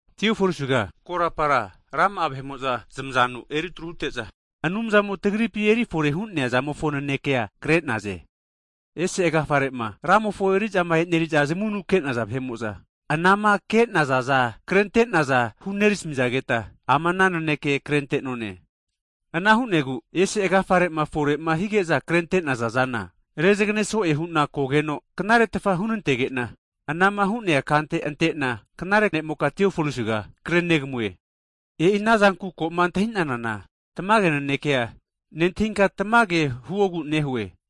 Tiofolisiga, korapara rama'a vahe'mo'za zmazanu eritru hute'za, Anumzamo tagripi erifore hu'nea zamofo nanekea kre'naze. Ese agafare'ma Ramofo eri'za e'neri'za zamavunuma ke'naza vahe'mo'za, anama ke'nazaza krente'naza hunerasamizageta, ama ana naneke krente'none. Ana hu'negu ese agafare'ma fore'ma hige'za krente'naza zana, rezagane so'e hu'na kogeno knaretfa hunantege'na, anama hu'nea kante ante'na, knare ne'moka Tiofolisiga kre'negamue. E'i anazanku koma antahinana tamage nanekea, nentahinka tamage huogu nehue.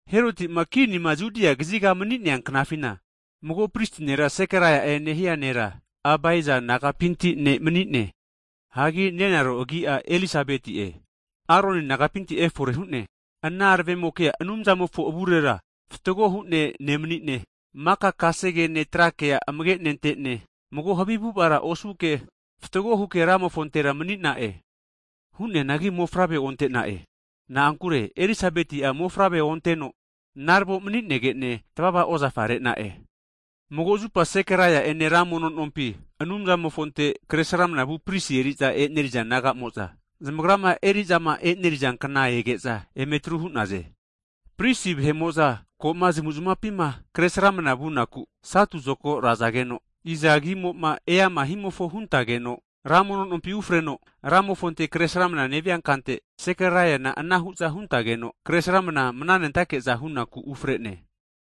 Herotima kinima Judia kaziga mani'nea knafina, mago prisi nera Sekaraia'e nehia nera, Abaiza nagapinti ne' mani'ne. Hagi nenaro agi'a Elisabeti'e, Aroni nagapinti efore hu'ne. Ana aravemokea Anumzamofo avurera fatgo hu'ne nemani'ne, maka kasegene tra kea amage nentene, mago havi avu'avara osuke, fatgo huke Ramofontera mani'na'e. Hu'neangi mofavre onte'na'e. Na'ankure Elisabeti'a mofavre onteno naravo mani'gene tvava ozafa re'na'e. Mago zupa Sekaraia ene ra mono nompi Anumzamofonte kre sramnavu prisi eri'za eneri'za nagamo'za, zamagrama eri'zama eneri'za kna ege'za emetru hu'naze. Prisi vahe'mo'za koma zamuzmapina kre sramna vunaku taisi zokago razageno, iza agimo'ma e'amama himofo huntageno ra mono nompi ufreno Ramofonte kre sramna nevia kante, Sekaraina ana hu'za huntageno kre sramna mananentake'za hu'naku ufre'ne.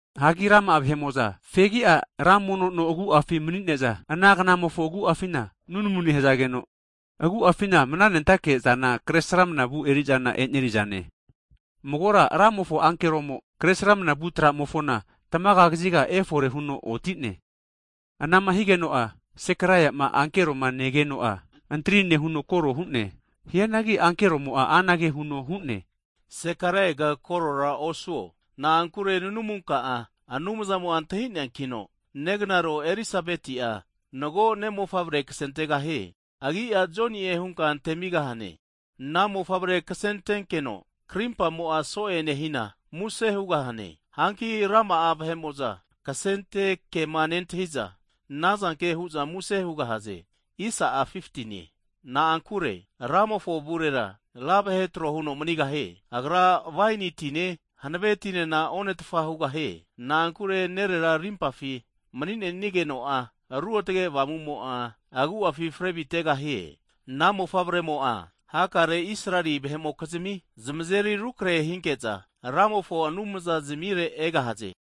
Hagi rama'a vahemo'za fegi'a ra mono no agu'afi manine'za, ana gnamofo agu'afina (hour) nunamu nehazageno agu'afina mananentake'zana kre sramna vu erizana eri'naze. Magora Ramofo ankeromo kre sramnavu tra'mofona tmaga kaziga efore huno oti'ne. Ana'ma higeno'a Sekaraiama ankeroma negeno'a, antri nehuno koro hu'ne. Hianagi ankeromo'a anage huno hu'ne, Sekaraiaga korora osuo, na'ankure nunamunka'a Anumzamo'a antahi'neankino, neganaro Elisabeti'a mago ne'mofavre kasentegahie. Agi'a Joni'e hunka antemigahane. Ana mofavre ksentenkeno krimpa so'e nehina muse hugahane. Hanki rama'a vahe'mo'za ana mofavrema ksente kema nentahiza anazanke hu'za muse hugahaze. Na'ankure Ramofo avurera ra vahe trohuno manigahie. Agra waini tine, hanave tinena onetfa hugahie. Na'ankure nerera rimpafi maninenigeno'a Ruotge Avamumo'a agu'afi fre avitegahie. Ana mofavremo'a hakare Israeli vahe'mokizmi zamazeri rukrahe hinke'za, Ramofo Anumza zimire egahaze.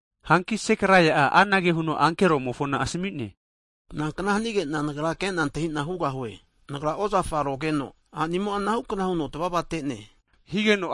Hanki Sekaraia anage huno ankeromofo asami'ne, nankna hanige'na nagra kena antahina hugahue? Nagra ozafa rogeno, a'nimo'a anahukna huno tvavate'ne higeno,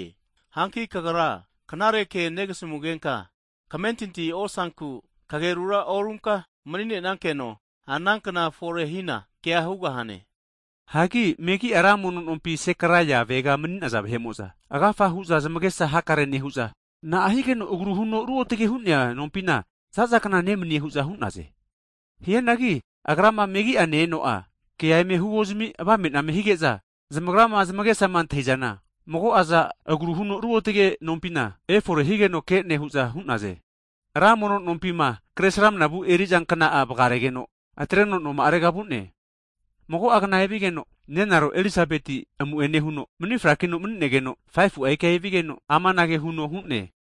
Hanki kagra knare ke negasamugenka kamentinti osanku, kagerura orunka mni'nenankeno ana kna forehina kea hugahane. Hagi megi'a ra mono nompi Sekaraia avega maninaza vahe'mo'za, agafa hu'za zmagesa hakare nehu'za, na'a higeno agru huno Ruotage hu'nea nompina zazakna nemanie hu'za hu'naze. Hianagi agrama megia ne-eno'a kea eme huozami avame name hige'za, zamagrama zmagesama antahizana, mago'aza agru huno routge nompina efore higeno ke'ne hu'za hu'naze. Ra mono nompima kre sramnavu eriza kna'amo vgaregeno, atreno noma'arega vu'ne. Mago'a gna evigeno, nenaro Elisabeti amu'ene huno mni frakino mani'negeno, 5fu'a ika enevigeno, amanage huno hu'ne.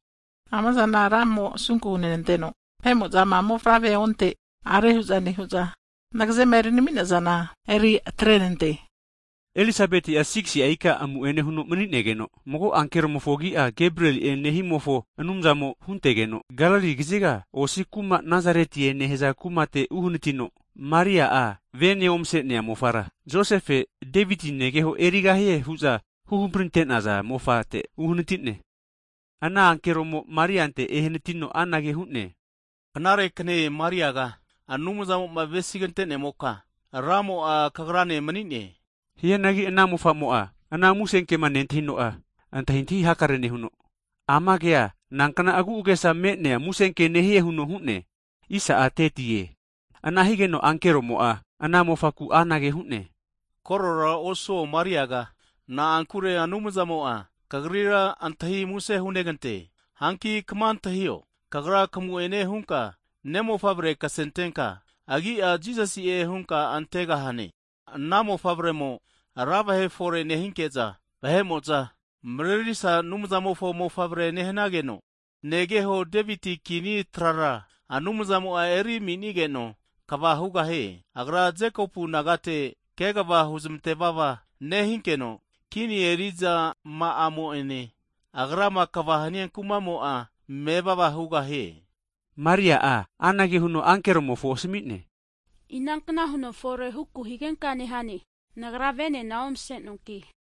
Amazana Ramo asunku hunenanteno vahe'mo'zama mofavre onte a're hu'za nehu'za nagazema eri nenamizana eri atre'nante. Elisabeti 6si'a ika amu'ene huno mani'negeno, mago ankeromofo agi'a Gebrieli'e nehimofo Anumzamo huntegeno, Galili kaziga osi kuma Nazaretie nehaza kumate uhanatino, Maria'a vene omase'nea mofara, Josefe Deviti negeho a' erigahie huza huhampriante'naza mofate uhanati'ne. Ana ankeromo Mariante ehanatino anage hu'ne, knare kne Mariaga, Anumzamo'ma avesigantenemoka, Ramo'a kagrane mni'ne. Hianagi ana mofamo'a, ana musenkema nentahino'a, antahintahi hakare nehuno, ama kea nankna agu'agesa me'nea musenke nehie huno hu'ne. Ana higeno ankeromo'a ana mofamofonku anage hu'ne, korora osuo Mariaga, na'ankure Anumzamo'a kagrira antahi muse hunegante. Hanki kma antahio, kagra kamu'ene hunka ne'mofavre ksentenka agi'a, Jisasi'e hunka antegahane. Ana mofavremo ra vahe fore nehinke'za vahemo'za, Marerisa Anumzamofo Mofavre nehnageno, negeho Deviti kini trara, Anumzamo'a eri aminigeno kva hugahie. Agra, Jekopu nagate kegva huzmantevava nehinkeno, kini erizama'amo ene Agrama kegva hania kumamo'a mevava hugahie. Maria'a anage huno ankeromofo asami'ne, inankna huno fore huku higenka nehane, nagra venena omasenoanki?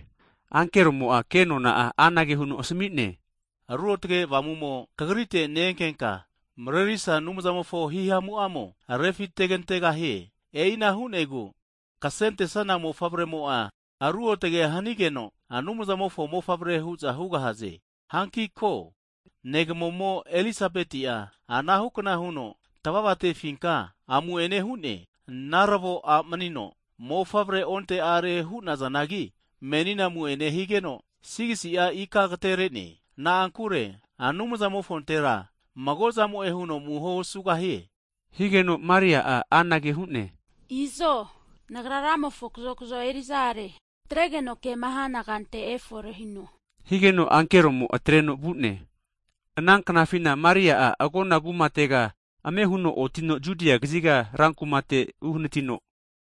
Ankeromo'a kenona'a anage huno asami'ne, Ruotge Avamumo kagrite ne-enkenka, Marerisa Anumzamofo hihamu'amo refitegantegahie. E'ina hu'negu ksentesana Mofavremo'a ruotge hanigeno, Anumzamofo mofavre hu'za hugahaze. Hanki ko, negamomo Elizabeti'a anahukna huno tavava'tefinka amu'ene hu'ne. Naravo a' manino mofavre onte are hu'nazanagi, menina amu'ene higeno' 6si'a ika agatere'ne. Na'ankure Anumzamofontera mago'zamo'e huno amuho osugahie. Higeno Mari'a anage hu'ne, izo nagra Ramofo kazokzo eriza are, atregeno kema hana kante efore hino, higeno ankeromo atreno vu'ne. Ana knafina Maria agona kumatega ame huno otino Judia kaziga rankumate uhanatino,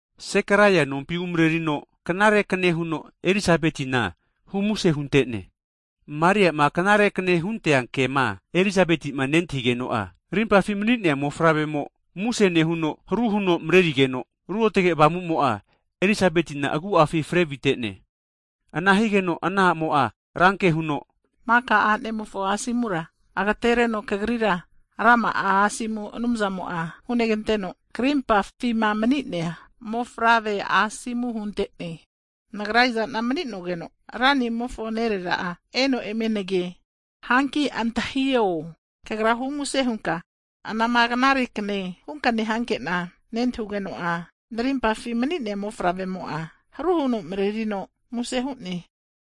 Sekaraia nompi umarerino, knare kne huno Elisabetina humuse huntene. Mariama knare kne huntea kema, Elisabetima netahigeno'a, rimpafi mani'nea mofavremo muse nehuno, haru huno marerigeno Ruotage Avamumo'a Elisabetina agu'afi frevite'ne. Ana higeno ana amo'a ranke huno, maka a'nemofo asomura agatereno kagrira rama'a asomu Anumzamo'a huneganteno, karimpafima mani'nea mofavrea asomu huntene! Nagra iza'na mani'nogeno Ranimofo nerera'a, eno eme nage. Hanki antahio, kagra humuse hunka, anama knare kne hunka nehankena nentahugeno'a, narimpafi mani'nea mofavremo'a haru huno marenerino muse hu'ne.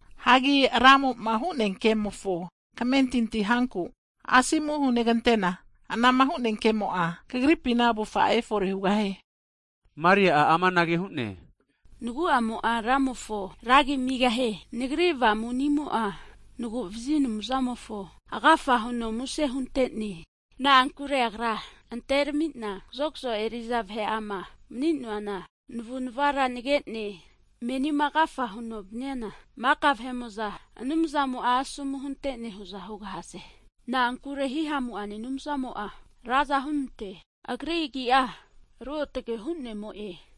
Hagi Ramo'ma hu'nea kemofo kamentinti hanku, asomu hunegantena, anama hu'nea kemo'a, kagripi avufa'a efore hugahie. Maria amanage hu'ne, nagu'amo'a Ramofo ragi amigeno, nagri avamunimo'a naguvazi Anumzamofo agafa huno muse huntene. Na'ankure Agra anteramina kazokzo eriza vahe'ama mni'noana navu'navara nage'ne. Menima agafa huno vaniana maka vahe'mo'za Anumzamo'a asomu hunte'ne hu'za hugahaze. Na'ankure Hihamu'ane Anumzamo'a raza hunante'ne, Agri agi'a ruotage hu'nemo'e.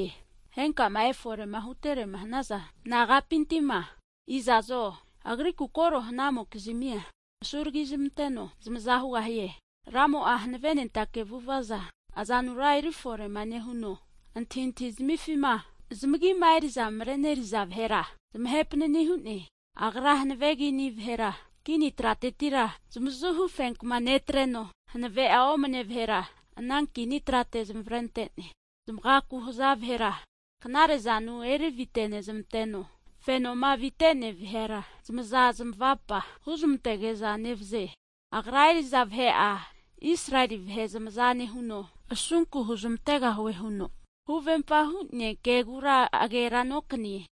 Henkama efore'ma huterema hanaza nagapinti'ma, iza'zo Agriku koro hanamokizmia asuragizmanteno zamaza hugahie. Ramo'a hanavenentake avu'avaza azanura eri fore'ma nehuno, antahintahizmifima zmagima eri'za mareneri'za vahera zmahe panani hu'ne. Agra hanave kini vahera, kini tratetira zmazuhu fenkama netreno, hanave'a omane vahera ana kini trate zamavre antene. Zmagaku haza vahera, knare'zanu erivite'nezmanteno, fenomo avitenea vahera, zmaza zamavapa huzmantege'za nevaze. Agra eri'za vahe'a Israeli vahe zmaza nehuno, asunku huzmantegahue huno huvempa hu'nea kegura agera nokanie.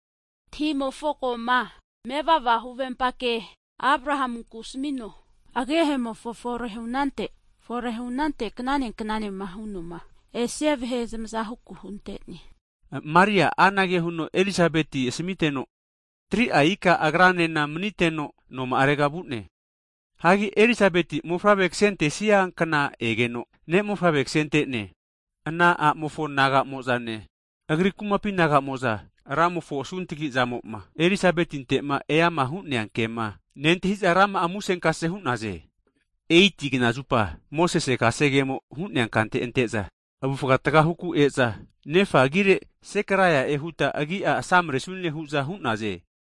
Tahi'mofo koma mevava huvempa ke Abrahanku asamino, agehemo fore hunante fore hunante knane knane hu'noma esia vahe zamaza huku hunte'ne. Maria anage huno Elisabeti asamiteno, 3'a ika agranena maniteno noma'arega vu'ne. Hagi Elisabeti mofavre kasentesia kna egeno, ne' mofavre ksente'ne. Ana a'mofo nagamo'zane, agri kumapi nagamo'za Ramofo asuntagizamo'ma Elisabetinte'ma eama hu'nea kema nentahiza rama'a musenkase hu'naze. Eit knazupa Mosese kasegemo'ma hu'nea kante ante'za avufa tga huku e'za, nefa agire Sekaraia'e huta agi'a asamresune hu'za hu'naze.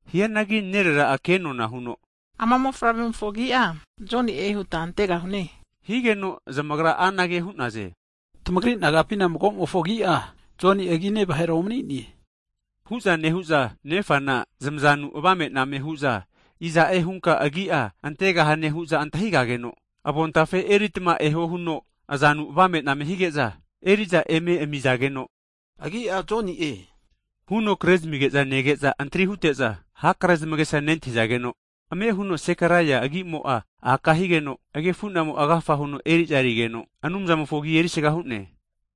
Hianagi nerera'a kenona huno, ama mofavre'mofo agi'a Joni'e huta antegahune higeno, zamagra anage hu'naze. Tamagri nagapina mago'mofo agi'a Joni'e agine vahera omani'ne. Hu'za nehu'za, nefana zmazanu avame'name hu'za iza'e hunka agi'a antegahane hu'za antahigageno, avontafe eritma eho huno azanu avame'name hige'za eriza eme amizageno, agi'a Joni'e huno kre zamige'za nege'za antri hute'za, hakare zamagesa nentahizageno, ame huno Sekaraia agimo'a aka higeno, agefunamo agafa huno eri'za erigeno, Anumzamofo agi erisaga hu'ne.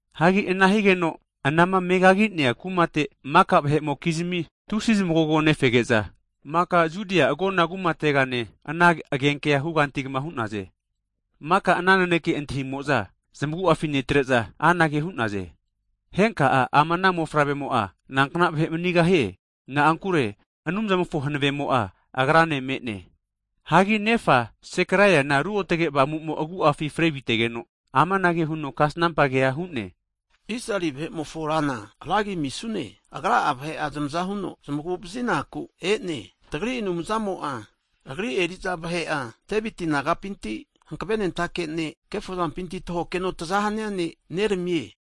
Hagi ana higeno, anama megaginea kumate maka vahe'mokizimi tusi zamagogo nefege'za, maka Judia agona kumatega ana agenkea hugantugma hu'naze. Maka ana naneke antahimo'za zmagu'afi netre'za, anage hu'naze. Henka ama ana mofavremo'a nankna vahe manigahie? Na'ankure Anumzamofo hanavemo'a agrane me'ne. Hagi nefa, Sekeraiana Ruotge Avamumo agu'afi frevitegeno, amanage huno kasnampa kea hu'ne, Israeli vahe'mofo Rana, ra agi amisune. Agra'a vahe'a zmaza huno zmagu'vazinaku e'ne. Tagri Anumzamo'a, Agri eri'za vahe'a Deviti nagapinti hankave'nentake ne' kefozampinti tahokeno taza hania ne' neramie.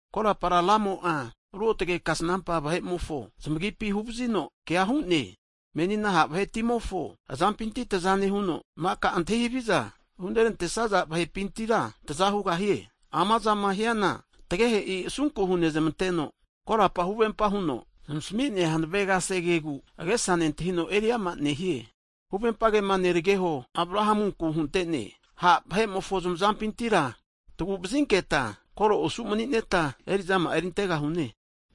Korapara Ramo'a ruotage kasnampa vahe'mofo zmagipi huvazino kea hu'ne. Menina ha' vahetimofo azampinti taza nehuno, maka antahi haviza hurantesaza vahepintira taza hugahie. Amazama hiana tagehe'i asunku hunezmanteno, korapa huhagerafino huvempa huno zamasmi'nea hanave kasegegu, agesa nentahino eriama nehie. Huvempa huhagerafi kema neregeho Abrahanku huntene. Ha' vahe'mofo zmazampintira tagu'vazinketa, koro osu manineta erizama'a erintegahune.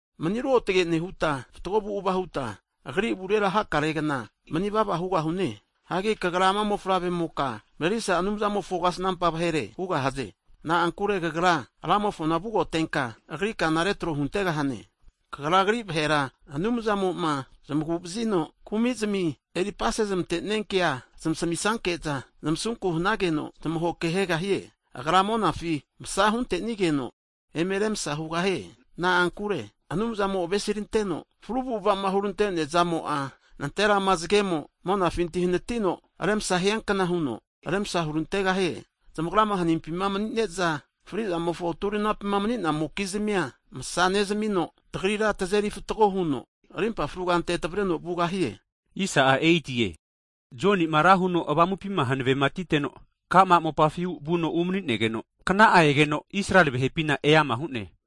Mani ruotge nehuta, fatgo avu'ava huta, Agri avurera hakare gna manivava hugahu'ne. Hagi kagra ama mofavre'moka, Marerisa Anumzamofo kasnampa vahere hugahaze. Na'ankure kagra Ramofona vugotenka Agri kana retro huntegahane. Kagra, Agri vahera Anumzamo'ma zmaguma vazino kumizimi eri apasezmante'nia kea zmasami'sanke'za, zmasunku hanageno zamagu'vazigahie. Agra monafi msa huntenigeno eme remsha hugahie. Na'ankure Anumzamo avesi ranteno fru avu'avama huranteazamo'a, nanterama zagemo monafinti hanatino remsa hiankna huno remsa hurantegahie. Zamagrama hanimpi manine'za frizamofo turinapi mni'namokizmia masa nezamino, tagrira tazeri fatgo huno rimpa fru kante tavereno vugahie. Jonima ra huno avamupima hanaveti'teno, ka'ma mopafi vuno umani'negeno, kna'a egeno Israeli vahepina eama hu'ne.